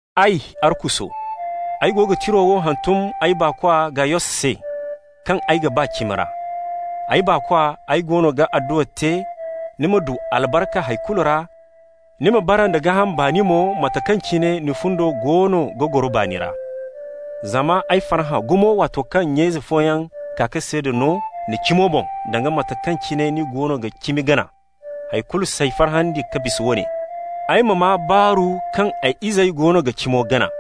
Ay, Arkuso, ay go ga tiro wo hantum ay baakwa Gayos se, kaŋ ay ga ba cimi ra. Ay baakwa, ay goono ga adduwa te ni ma du albarka hay kulu ra, ni ma bara nda gaaham baani mo, mate kaŋ cine ni fundo goono ga goro baani ra. Zama ay farhã gumo waato kaŋ nya-ize fooyaŋ kaa ka seeda no ni cimo boŋ, danga mate kaŋ cine ni goono ga cimi gana. Hay kulu s'ay farhandi ka bisa woone: ay ma maa baaru kaŋ ay izey goono ga cimo gana.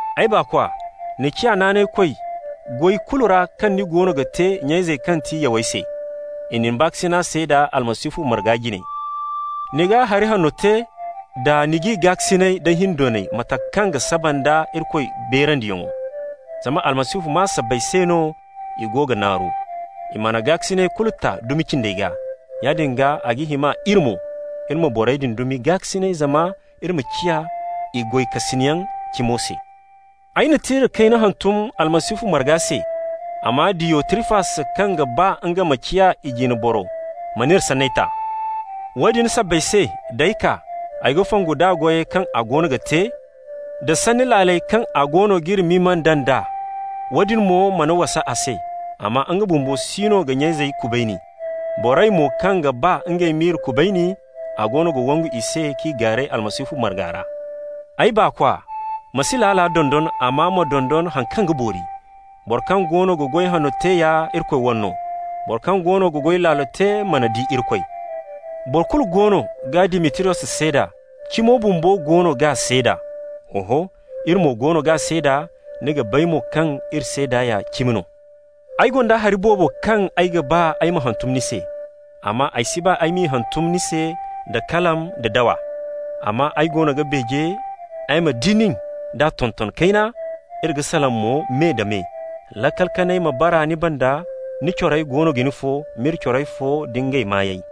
Ay baakwa, ni ciya naanaykoy goy kulu ra kaŋ ni goono ga te nya-izey kaŋ ti yawey se. I na ni baakasina seeda Almasihu marga jine. Ni ga hari hanno te da ni g'i gaakasinay da hindoonay mate kaŋ ga saba nda Irikoy beerandiyaŋo. Zama Almasihu maa sabbay se no i go ga naaru. I mana gaakasinay kulu ta dumi cindey gaa. Yaadin gaa, a ga hima iri mo, iri ma borey din dumi gaakasinay, zama iri ma ciya i goykasinyaŋ cimo se. Ay na tira kayna hantum Almasihu marga se, amma Diyotrifas, kaŋ ga ba nga ma ciya i jine boro mana iri sanney ta. Woodin sabbay se, d'ay kaa ay ga fongu nd'a goyey kaŋ a goono ga te, da sanni laaley kaŋ a goono g'iri mimanda nd'a. Woodin mo mana wasa a se, amma nga bumbo siino ga nya-izey kubayni. Borey mo kaŋ ga ba ngey m'i kubayni, a goono ga wangu i se k'i gaaray Almasihu marga ra. Ay baakwa, ma si laala dondon, amma ma dondon haŋ kaŋ ga boori. Boro kaŋ goono ga goy hanno te ya Irikoy wane no. Boro kaŋ goono ga goy laalo te mana di Irikoy. Boro kulu goono ga Dimitriyos seeda, cimo bumbo mo goono g'a seeda. Oho, iri mo goono g'a seeda, ni ga bay mo kaŋ iri seeda ya cimi no. Ay gonda hari boobo kaŋ ay ga ba ay ma hantum ni se, amma ay si ba ay m'i hantum ni se da kalam da dawa. Amma ay goono ga beeje ay ma di nin d'a tonton kayna, iri ga salaŋ mo me-da-me. Laakal kanay ma bara ni banda. Ni corey goono ga ni fo. M'iri corey fo da ngey maayey.